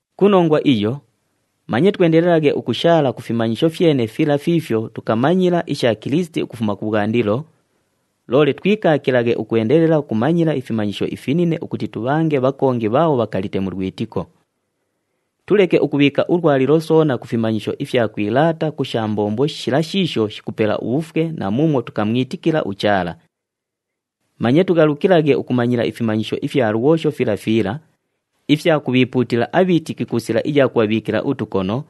Ku nongwa iyo, manye twendelelaghe ukushaala ku fimanyisho fyene fila fiifyo tukamanyila isha Kilisiti ukufuma kubhwandilo, loole twikaakilaghe ukwendelela ukumanyila ifimanyisho ifinine ukuti tubhange bhakongi bhaabho bhakalite mu lwitiko. Tuleke ukubhiika ulwalilo soona ku fimanyisho ifya kwilaata ku sha mbombo shila shiisho shikupela ubhufwe na muumwo tukamwitikila uChaala. Manye tughalukilaghe ukumanyila ifimanyisho ifya lwosho fila fila, ifya kubhiipuutila abhiitiki ku sila iya kubhabhiikila utukono,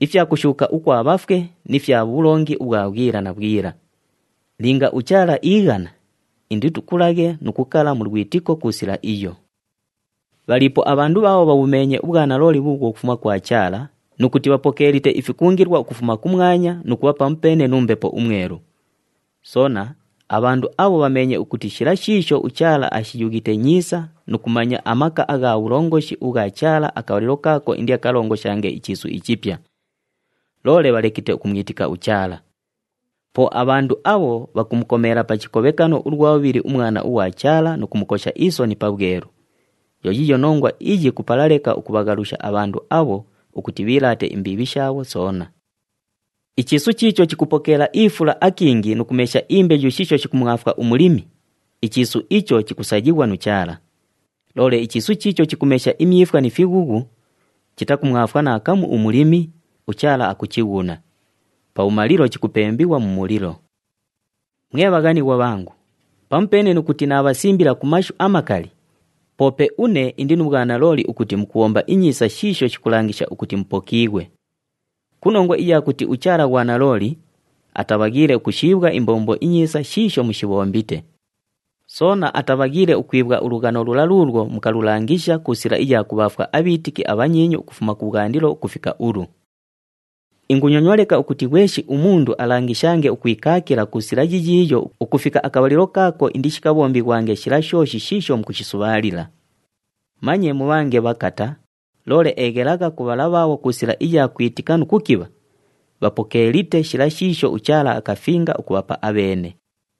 ifya kushuuka ukwa bhafwe ni fya bhulongi ubhwa bhwila na bhwila. Linga uChaala iighana, inditukulaghe nu kukala mu lwitiko ku sila iyo. Bhaliipo abhandu bhaabho bhabhumeenye ubhwanalooli bhuubhwo bhukufuma kwa Chaala nu kuti bhapokeelite ifikungilwa ukufuma kumwanya nu kubha pamupeene nu Mbepo uMwelu. Soona, abhandu abho bhameenye ukuti shila shiisho uChaala ashiyughite nyiisa nu kumanya amaka agha bhulongoshi ubhwa Chaala akabhalilo kaako indiakalongoshange ichiisu ichipya. Loole bhalekite ukumwitika uChaala. Po abhandu abho bhakumukomeela pa chikobhekano ulwa bhubhili uMwana ughwa Chaala nu kumukosha isoni pabhwelu. Yo yiiyo nongwa iyi kupala leka ukubhaghalusha abhandu abho ukuti bhiilaate imbiibhi shaabho soona. Ichiisu chiicho chikupokeela ifula akingi nu kumesha imbeyu shiisho shikumwafwa umulimi, ichiisu icho chikusayighwa nu Chaala. Loole ichiisu chiicho chikumesha imyifwa ni fighughu, chitakumwafwa naakamu umulimi, uChaala akuchighuna. Pabhumalilo chikupembighwa mu mulilo. Mwe bhaghanighwa bhangu, pamupeene nu kuti naabhasimbila ku mashu amakali, poope une indi nu bhwanalooli ukuti mukubhomba inyiisa shiisho shikulangisha ukuti mupokiighwe. Ku nongwa iya kuti uChaala ghwanalooli, atabhaghiile ukushiibhwa imbombo inyiisa shiisho mushibhombite. Soona atabhaghiile ukwibhwa ulughano lula luulwo mukalulangisha ku sila iya kubhaafwa abhiitiki abhanyiinyu ukufuma kubhwandilo ukufika ulu. Ingunyonywa leka ukuti ghweshi umundu alangishange ukwikaakila ku sila yiyiiyo ukufika akabhalilo kaako indishikabhombighwange shila shooshi shiisho mukushisubhaalila. Manye mubhange bhakata, loole eghelagha ku bhala bhaabho ku sila iya kwitika nu kukibha, bhapokeelite shila shiisho uChaala akafinga ukubhapa abheene.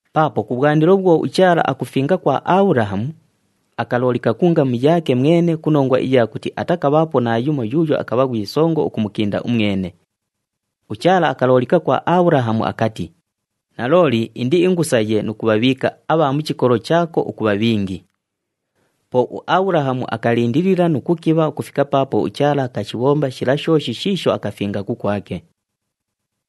Paapo kubhwandilo bhwo uChaala akufinga kwa Abhulahamu, akaloolika ku ngamu yaake mwene ku nongwa iya kuti atakabhaapo naayumo yuuyo akabha ghwi songo ukumukinda umwene. UChaala akaloolika kwa Abhulahamu akati, “Nalooli indiingusaye nu kubhabhiika abha mu chikolo chaako ukubha bhingi.” Po uAbhulahamu akalindilila nu kukibha ukufika paapo uChaala akashibhomba shila shooshi shiisho akafinga kukwake.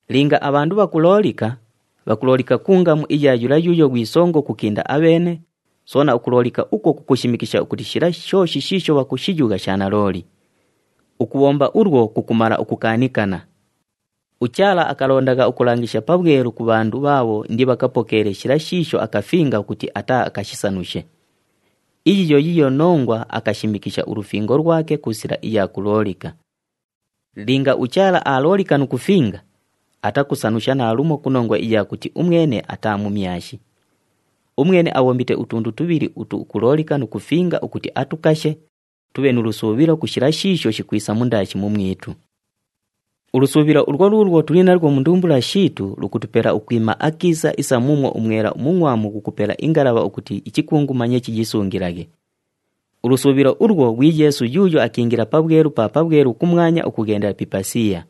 Linga abhandu bhakuloolika, bhakuloolika ku ngamu iya yula yuuyo ghwi songo ukukinda abheene, soona ukuloolika ukwo kukushimikisha ukuti shila shooshi shiisho bhakushiyugha sha nalooli. Ukubhomba ulwo kukumala ukukaanikana. UChaala akalondagha ukulangisha pabhwelu ku bhandu bhaabho indibhakapokeele shila shiisho akafinga ukuti ataaakashisanushe. Iyi yo yiiyo nongwa akashimikisha ulufingo lwake ku sila iya kuloolika. Linga uChaala aaloolika nu kufinga, atakusanusha naalumo ku nongwa iya kuti umwene ataa mumyashi. Umwene abhombite utundu tubhili utu ukuloolika nu kufinga ukuti atukashe, tubhe nu lusuubhilo ku shila shiisho shikwisa mundaashi mumwitu. Ulusuubhilo ulwo luulwo tuli nalwo mu ndumbula shiitu lukutupela ukwima akiisa isa muumwo umwela umungʼwamu ghukupela ingalabha ukuti ichikungu manye chiyisungilaghe. Ulusuubhilo ulwo ghwi Yeesu yuuyo akiingila Pabhwelu pa Pabhwelu kumwanya ukughendela pi ipasiya.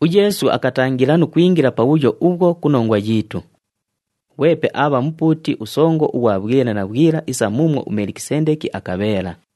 UYeesu akatangila nu kwingila pabhuyo ubhwo ku nongwa yiitu. Ghwepe aabha Mupuuti uSongo ughwa bhwila na bhwila isa muumwo uMelikisendeki akabheela.